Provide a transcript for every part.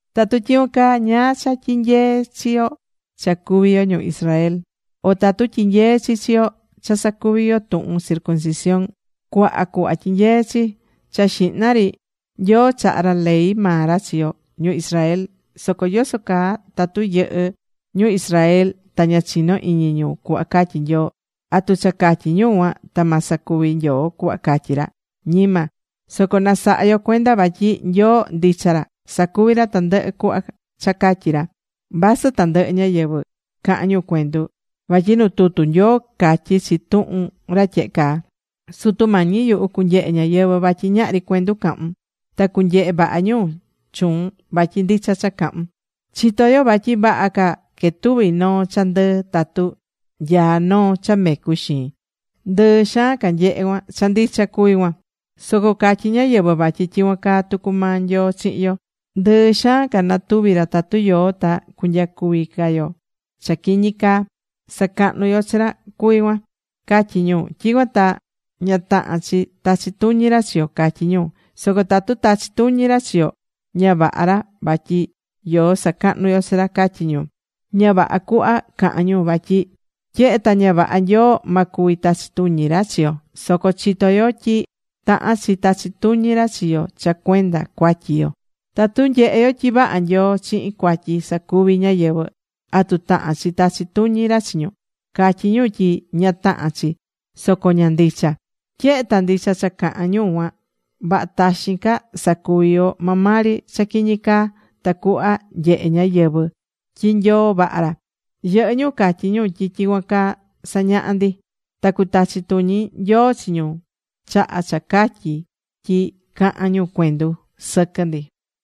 Tatu tyicuan caa, ¿ñáá cha tyinyeé chi yo cha cuví yo ñu Israel? ¿O atu tyinyeé chi chi yo cha sacuví yo tuhun circuncisión? Cuaha cuhva tyinyeé chi. Cha xihna ri, Nyoo chaha̱ ra ley maa ra chi yo ñu Israel. Soco yoso caa tatu yɨhɨ́ ñu Israel ta ña chinó iñi ñu cuhva catyí Nyoo, ¿atu cha catyí ñu cuan ta ma sacuvi ca Nyoo cuhva catyí ra? ¡Ñima! Soco na saha yo cuenda vatyi Nyoo ndicha ra. Sacuví ra tandɨhɨ cuhva cha catyí ra. Vasɨ tandɨhɨ ñáyɨvɨ cahán ñu cuendu. Vatyi nu tutu Nyoo catyí chi tuhun ra tyehe caa: Sutu Mañi yuhu, cunyehe ñáyɨvɨ vatyi ñahri cuendu cahún. Ta cunyehe vaha ñu chuun vatyi ndicha cha cahún. Chitó yo vatyi vaha ca quetuvi noo cha ndɨɨ tatu nyaá noo cha mecu xiin. Ndɨɨ xaan ca nyehe cuan. Cha ndicha cuví cuan. Soco catyí ñáyɨvɨ vatyi tyicuan caa tucu maa Nyoo chihin yo, ndɨɨ xaan ca natuvi ra tatu yoó ta cunyacuvi ca yo cha quiñi caa. Sacahnú yo chi ra cuví cuan, catyí ñu. Tyicuan ta ña tahán chi tachi tuñi ra chi yo, catyí ñu. Soco tatu tachí tuñi ra chi yo, ña vaha ra vatyi yoó sacahnú yo chi ra, catyí ñu. Ña vaha cuhva cahán ñu, vatyi tyehe ta ña vaha Nyoo ma cuvi tachi tuñi ra chi yo. Soco chitó yo tyi tahán chi tachi tuñi ra chi yo cha cuenda cuatyi yo. Tatu nyehé yo tyi vaha Nyoo chihin cuatyi sacuví ñáyɨvɨ, ¿atu tahán chi tachi tuñi ra chi ñu? Catyí ñu tyi ña tahán chi, soco ña ndicha. Tyehe ta ndicha cha cahán ñu cuan, vaha taxin ca sacuvi yo maa maa ri cha quiñi caa tacuhva nyehe ñáyɨvɨ tyi Nyoo vaha ra. Yɨhɨ́ ñu catyí ñu tyi tyicuan caa sañahá ndi. Ta cutachi tuñi Nyoo chi ñu chaha cha catyí tyi cahán ñu cuendu sɨquɨ ndi.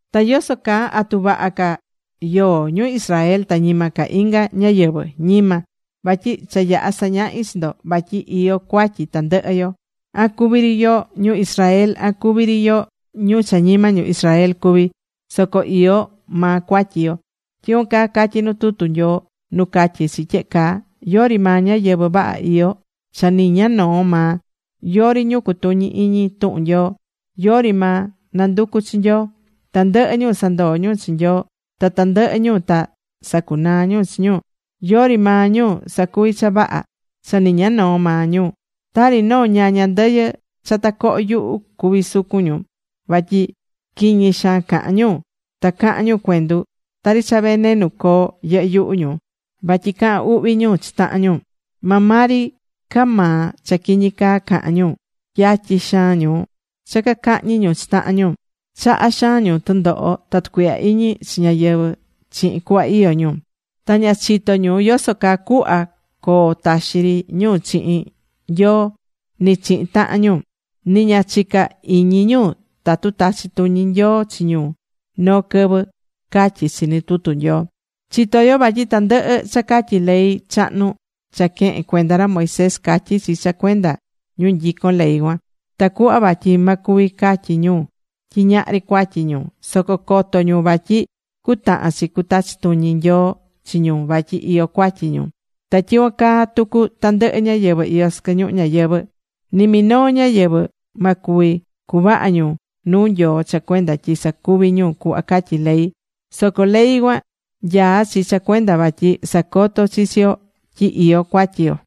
Ta yoso caa ¿atu vaha ca yoó ñu Israel ta ñima ca inga ñáyɨvɨ? ¡Ñima! Vatyi cha yaha̱ sañahi chi ndo vatyi iyó cuatyi tandɨhɨ yo. An cuví ri yo ñu Israel, an cuví ri yo ñu cha ñima ñu Israel cuví, soco iyó maa cuatyi yo. Tyicuan caa catyí nu tutu Nyoo, nu catyí chi tyehe caa: Yori maa ñáyɨvɨ vaha iyó, cha ni ña noo maa. Yori ñu cutuñí iñi tuhun Nyoo. Yori maa nanducú chi Nyoo. Tandɨhɨ ñu sandoo̱ ñu chi Nyoo, ta tandɨhɨ ñu ta sacunaa̱ ñu chi ñu. Yori maa ñu sacuví cha vaha. Cha ni ña noo maa. Tari noo ñaña ndɨyɨ cha tacohó yuhu cuví sucun ñu. Vatyi quiñi xaan cahán ñu. Ta cahán ñu cuendu. Tari cha venenu coo yɨhɨ́ yuhu ñu vatyi cahán uhvi ñu chi tahan ñu. Maa maa ri ca maa cha quiñi caa cahán ñu. Yatyi xaan ñu cha cacahñi ñu chi tahan ñu. Chahá xaan ñu tundoho ta tucuihya iñi chi ñáyɨvɨ chihin cuhva iyó ñu. Ta ña chitó ñu yoso caa cuhva coo taxi ri ñu chihin Nyoo, ni chihin tahan ñu. Ni ña chicá iñi ñu tatu tachi tuñi Nyoo chi ñu noo quɨvɨ, catyí chi nu tutu Nyoo. Chitó yo vatyi tandɨhɨ cha catyí ley chahnu cha quehen cuenda ra Moisés, catyí chi cha cuenda ñu nyicón ley cuan, tacuhva vatyi ma cuvi catyi ñu tyi ñahri cuatyi ñu. Soco coto ñu vatyi cutahan chi cutachi tuñi Nyoo chi ñu vatyi iyó cuatyi ñu. Ta tyicuan caa tucu tandɨhɨ ñáyɨvɨ iyó sɨquɨ ñuhu ñayɨvɨ̱. Ni minoo ñáyɨvɨ ma cuvi cuvaha ñu nuu Nyoo cha cuenda tyi sacuví ñu cuhva catyí ley. Soco ley cuan nyaá chi cha cuenda vatyi sacotó chi chi yo tyi iyó cuatyi yo.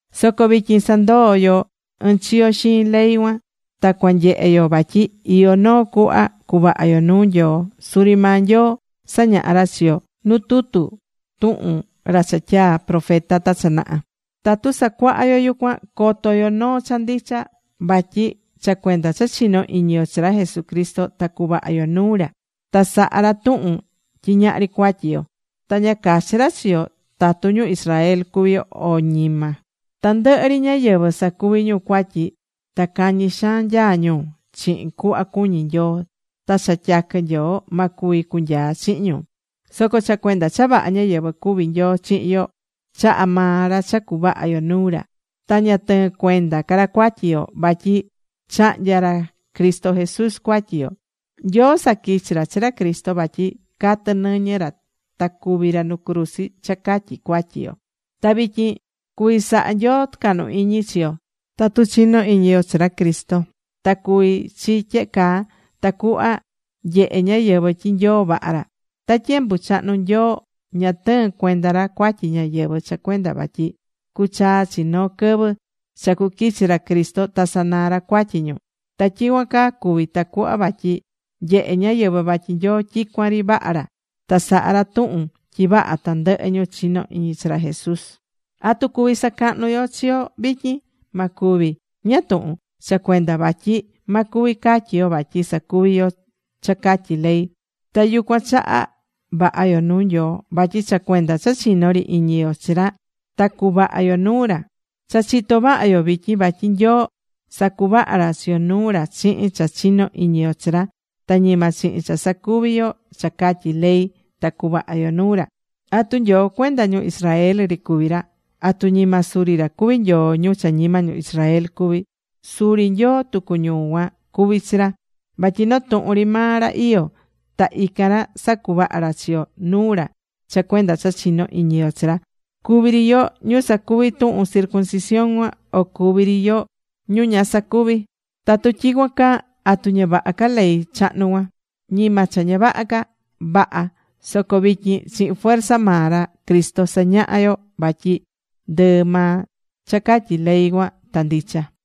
Soco vityin sandoó yo ɨnchiyo xiin ley cuan ta cua nyehe yo vatyi iyó noo cuhva cuvaha yo nuu Nyoo. Suri maa Nyoo sañaha̱ ra chi yo nu tutu tuhun ra cha tyaa̱ profeta ta cha naha. Tatu sacuahá yo yucuan, coto yo noo cha ndicha. Vatyi cha cuenda cha chinó iñi yo chi ra Jesucristo ta cuvaha yo nuu ra, ta sahá ra tuhun tyi ñahri cuatyi yo. Ta ña cachí ra chi yo tatu ñu Israel cuví yo o ñima. Tandɨhɨ ri ñáyɨvɨ sacuví ñu cuatyi, ta cañi xaan nyaá ñu chihin cuhva cuñí Nyoo, ta cha tyaquɨ Nyoo ma cuvi cunyaa chihin ñu. Soco cha cuenda cha vaha ñáyɨvɨ cuví Nyoo chihin yo, chahá maa ra cha cuvaha yo nuu ra, ta ña tɨɨ̱n cuenda ca ra cuatyi yo. Vatyi chahnya̱ ra Cristo Jesús cuatyi yo. Nyoo saquichi̱ ra chi ra Cristo vatyi catɨ nɨñɨ ra ta cúvi ra nu cruzi cha catyi cuatyi yo. Ta vityin cuví saha Nyoo tucahnu iñi chi yo tatu chinó iñi yo chi ra Cristo. Ta cuvi̱ chi tyehe caa, tacuhva nyehe ñáyɨvɨ tyi Nyoo vaha ra. Ta tyembu chahnu, Nyoo ña tɨɨ̱n cuenda ra cuatyi ñáyɨvɨ cha cuenda vatyi cuchaa chi noo quɨvɨ cha cuquichi ra Cristo ta sanaa ra cuatyi ñu. Ta tyicuan caa cuvi̱ tacuhva vatyi nyehé ñáyɨvɨ vatyi Nyoo tyicuan ri vaha ra, ta saha̱ ra tuhun tyi vaha tandɨhɨ ñu chinó iñi chi ra Jesús. ¿Atu cuví sacahnu yo chi yo vityin? Ma cuvi. ¿Ñáá tuhun? Cha cuenda vatyi ma cuvi catyi yo vatyi sacuví yo cha catyí ley, ta yucuan chaha vaha yo nuu Nyoo. Vatyi cha cuenda cha chinó ri iñi yo chi ra ta cuvaha yo nuu ra. Cha chitó vaha yo vityin vatyi Nyoo sacuvaha̱ ra chi yo nuu ra chihin cha chinó iñi yo chi ra, ta ñima chihin cha sacuví yo cha catyí ley ta cuvaha yo nuu ra. ¿Atu Nyoo cuenda ñu Israel ri cuví ra? ¿Atu ñima suri ra cuví Nyoo ñu cha ñima ñu Israel cuví? Suri Nyoo tucu ñu cuan cuví chi ra. Vatyi noo tuhun ri maa ra iyó. Ta ican ra sacuvaha̱ ra chi yo nuu ra cha cuenda cha chinó iñi yo chi ra. Cuví ri yo ñu sacuvi̱ tuhun circuncisión cuan, o cuví ri yo ñu ña sacuvi̱. Tatu tyicuan caa, ¿atu ña vaha ca ley chahnu cuan? ¡Ñima cha ña vaha ca! Vaha. Soco vityin chihin fuerza maa ra Cristo sañahá yo vatyi ndɨɨ maa cha catyí ley cuan ta ndicha.